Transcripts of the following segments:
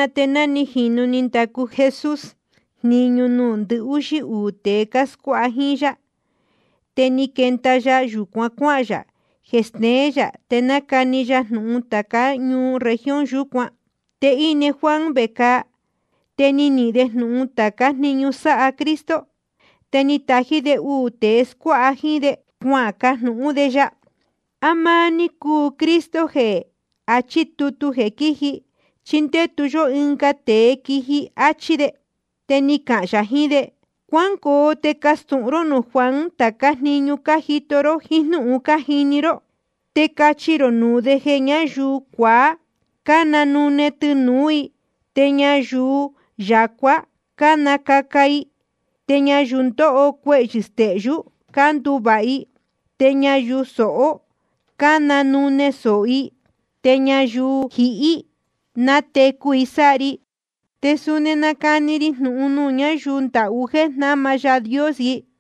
Te ná ni jīnu ni ndacu Jesús jniñu nuū ndɨhúxí uū tēe cáscuáha jíín yá, te ni quenda ya yūcuan cuáhān yā jeē steén yā te nacani ya jnūhun tācá ñuu región yūcuán. Te íne Juan vecāa. Te ni nihīn de jnūhun tācá jniñu sáha Cristo. Te ni tají de uū tēe cáscuáha jíín de, cuacajnūhún de ya: ¿A máá ní cúu Cristo jeē achí tutu jeē quíji, chí condetu yó ɨnga tēe quiji? áchí de. Te ni cahān yā jiín de: Cuángoo te castūhun ró nuū Juan tācá jniñu cájito ró jíín jnúhun cájini ró. Te cachi rō nuū de jeē ñáyuu cuaá cánanune tɨnūú i, te ñayuu yacuá cánacaca i, te ñayuu ndóho cuehyɨ̄ stehyú cánduvāha i, te ñayuu sohó cánanune sōho i, te ñayuu jihí nátecu i sáha ri. Te suni nácani ri jnūhun nuū ñáyuu ndahú jéē jnama Yaā Dios i.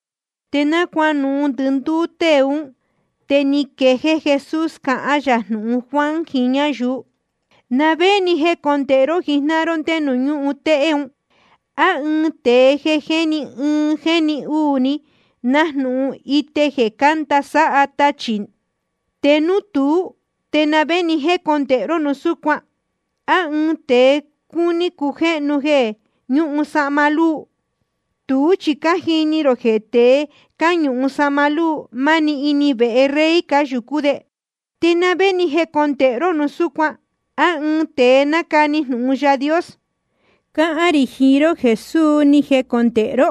Te náa cuanuhun ndɨndúú tée ún, te ni quejéé Jesús cahán yā jnūhun Juan jiín ñáyuu: ¿Na vé ni jécondēhe ró jijnáhan ró nde nuū ñúhun téhé? ¿A ɨɨn tēe jéni ɨɨn jéni uū ni, nájnūhun ite jeē cánda sáha tachī? Te núu tuú, ¿te na vé ni jécondēhe ró núu súcuan? ¿A ɨɨn tēe cúní cujéhnu jeē ñúhun sahma lúu? Tuú chi cájini rō jeē tēe cáñuhun sahma lúu, máni ini vehe rey cáyūcú de. ¿Te na vé ni jécondēhe ró núu súcuan? ¿A ɨɨn tēe nácani jnūhun Yaā Dios? Cáhán rī jiín ró jeē suu ni jecondēhe ró,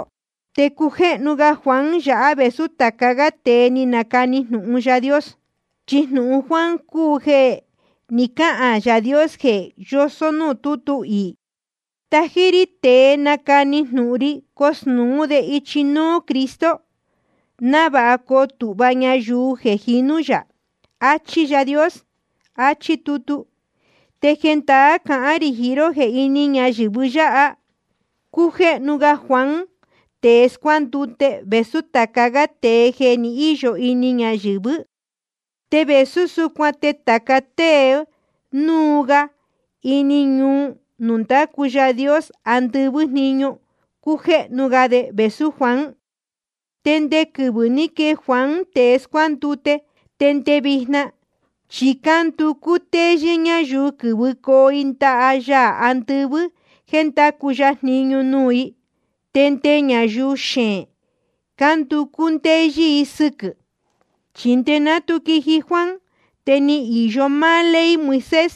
te cújéhnu ga Juan yáha vēsú tāca gá tēe ni canacani jnūhun Yaā Dios. Chi jnūhun Juan cúu jeē ni cáhān Yaā Dios jeē yosó núū tútu iī: Tají rí tēe nacani jnūhun ri cosnūú de ichi núú Cristo, návāha coo tūhva ñayuu jeē jinú yā. Achí Yaā Dios, achí tutu. Te jendaá cahán rī jiín ró jeē ini ñayɨ̄vɨ yáha cújéhnu ga Juan tēe scuándute vēsú tāca gá tēe jeē ni íyo ini ñayɨ̄vɨ́. Te vēsú súcuan te tāca tée núu ga ini ñuu nuū ndácu Yaā andɨvɨ́ jniñu, cújéhnu ga de vēsú Juan. ’Te nde quɨvɨ̄ ní quee Juan tēe scuándute, te nde vijna, chi cánducú ndéyɨ́ ñáyuu quɨ́vɨcoo i ndaha Yaā andɨvɨ́ jéē ndácu ya jniñu nuū i. Te nde ñayuu xeēn cánducú ndéyɨ́ i sɨquɨ̄. Chi nde ná tu quiji Juan, te ni īyo máá ley Moisés,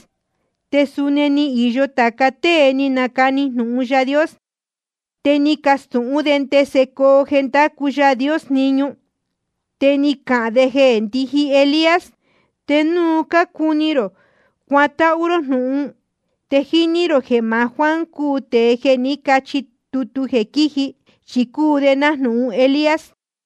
te suni ni īyo tāca tée ni canacani jnūhun Yaā Dios. Te ni cacastūhún de ndese coo jeē ndacu Yaā Dios jniñu. Te ni cacahān de jeē ndíji Elías. Te núu cácuni rō cuatáhú ró jnūhun, te jíní rō jeē maá Juan cúu tēe jeē ní cachi tutu jeē quíji, chi cúu de nájnūhun Elías.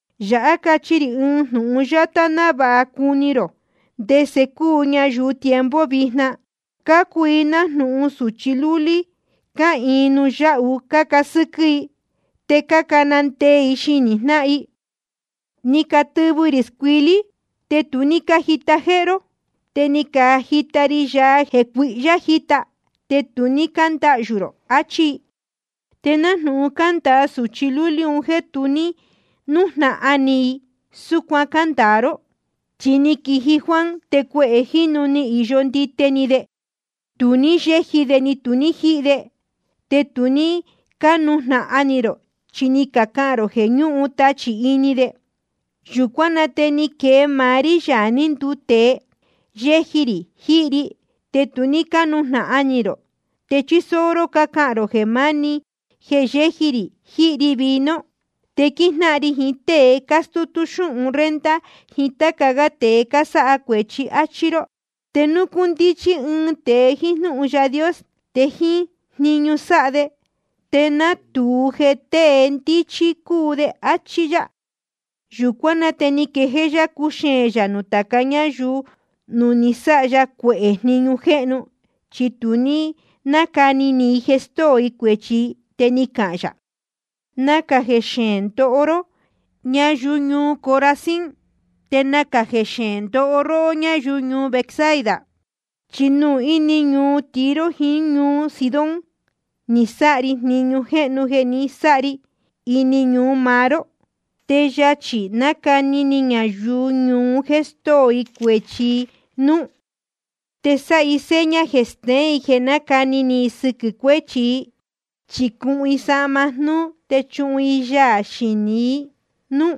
’Yāhá cachi rī ɨɨn jnūhun yátá návāha na cúni rō ndese cúu ñayuu tiempo vijna. Cúu i nájnūhun sūchi lúlí cáhīin nuū yáhu cácasɨ́quɨ́ i. Te cácana ndee i xinī jnáhan i: Ni catɨvɨ rī scuilí, te tu ní cájita jéhé ró. Te ni cajita ri yaa jeē cuihyá jíta, te tu ní cándahyū rō, achí i. Te nájnūhun cándāa sūchi lúlí un jéē tu ní nújnahan ni i ni ɨɨn, súcuan cándāa ró. Chi ni quiji Juan te cuehē jínu ni īyo ndite ni de, tu ní yéji de ni tu ní jíhi de. Te tu ní cánujnahan ni rō, chi ni cacahān rō jeē ñúhun tachī ini de. Yūcuán na te ni quee maá rí, Yaā ní nduu tēe, te yéji rī jíhi ri, te tu cánujnahan ni rō, te chísóó jnúhun ró cácahān rō jeē máni máá jéē yéji rī jíhi ri vino. Te quíjnáhan ri jiín tée cástútú xúhun renta jiín táca gá tēe cásáha cuēchi, áchí ró. Te núu cúndíchí ɨɨn tēe jíín jnúhun Yaā Dios, te jíín jniñu sáha de te nátūu jeē tée ndíchí cúu de. Achí yá. Yūcuán na te ni quejéé yá cúxeēn yā nuū tācá ñuu nuū ni sáha ya cuehē jniñu jéhnu, chi tu ní cánacani ni i jeē stóo i cuēchi i. Te ni cahān yā: Nacā jeē xeēn ndoho ró, ñáyuu ñuu Corazín. Te nacā jeē xeēn ndoho ró, ñáyuu ñuu Betsaida. Chi núu ini ñuu Tiro jiín ñuu Sidón ni sáha ri jniñu jéhnu jeē ni sáha ri ini ñuu maá ró, te yachī nacani ni ñayuu ñuu un jéē stóo i cuēchi i núú. Te sáha i seña jeē steén jeē nácani ni i sɨquɨ̄ cuéchi i, chi cuhun i sahma jnúú te chuhun i yaā xinī i núú.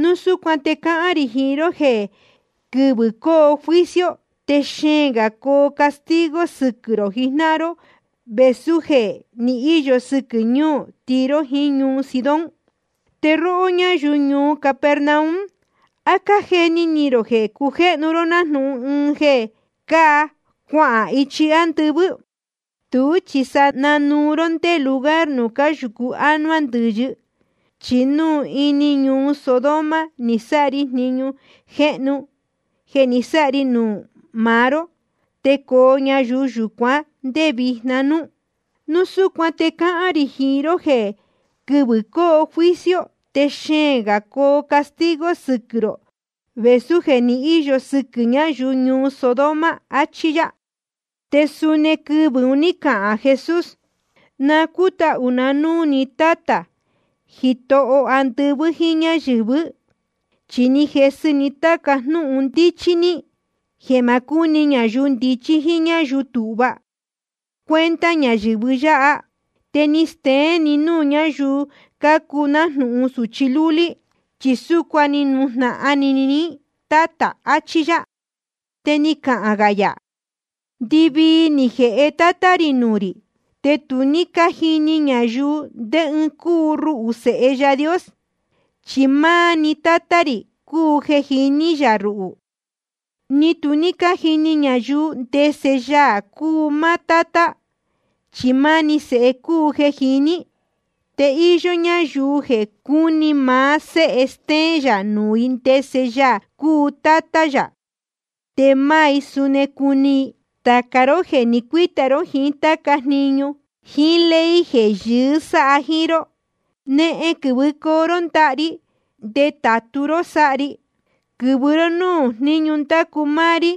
Núu súcuan te cáhán rī jiín ró jeē quɨvɨ̄ coo juicio te xeēn gā coo castigo sɨquɨ̄ rō jijnáhan ró vēsú jeē ni íyo sɨquɨ̄ ñuu Tiro jiín ñuu Sidón. Te róhó ñáyuu ñuu Capernaum, ¿á cájeni ni rō jeē cujéhnu ró nájnūhun ɨɨn jeē cáa cuahān ichi ándɨvɨ́? Tuú chi sa nanuu ró ndé lugar nuū cáyūcu ánuá ndɨ̄yɨ. Chi núu ini ñuu Sodoma ni sáha ri jniñu jéhnu jeē ni sáha ri nuū maá ró, te coo ñuu yúcuan ndé vijna núú. Núu súcuan te cáhán rī jiín ró jeē quɨvɨ̄ coo juicio te xeēn gā coo castigo sɨquɨ̄ rō vēsú jeē ni íyo sɨquɨ̄ ñáyuu ñuu Sodoma. Achí yá. Te suni quɨvɨ̄ un ní cahān Jesús: Na cútahū na núū ni Tátā, Jitoho andɨvɨ́ jíín ñáyɨ̄vɨ́. Chi ni jesɨ ní táca jnúhun ndíchí ní, jeē ma cúni ñayuu ndichí jíín ñáyuu tūhva cuenta ñayɨ̄vɨ yáha. Te ni steén ni núū ñáyuu cácuu nájnūhun sūchi lúlí. Chi súcuan ni nujnahan ni ni Tátā, achí yá. Te ni cahān gā yā: Ndɨvii ni jēhe Tátá rī nuū rī. Te tu cájini ñayuu ndé ɨɨn cúu ruhū, Sēhe Yaā Dios, chi máá‑ni Tátá rī cúu jeē jiní yā ruhū. Ni tu cájini ñayuu ndese Yaā cúu máá Tátá, chi máá‑ni Sēhe cúu jeē jiní. Te íyó ñáyuu jeē cuní maá Séhe stéén yā nuū i ndese Yaā cúu Tátá yā, te máá i suni cuni i. Tāca ró jéē ni cuíta ró jiín táca jniñu jíín ley jeē yɨɨ́ sáha jíín ró, nehen quɨ̄vɨcoo ró ndaha ri, te ndetātu ró sáha ri. Quɨ̄vɨ ró núū jníñu ndácu máá rí,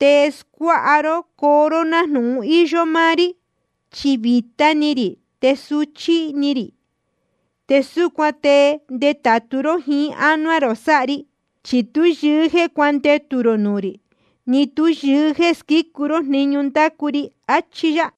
te scuáha ró coo ró nájnūhun íyó máá rí. Chi vītá ni rī te suchí ni rī. Te súcuan te ndetātu ró jiín ánuá rō sáha ri. Chi tú yɨɨ́ jéē cuandetū rō nuū rī, ni tú yɨɨ́ jéē squícu ró jniñu ndácu ri. Achí yá.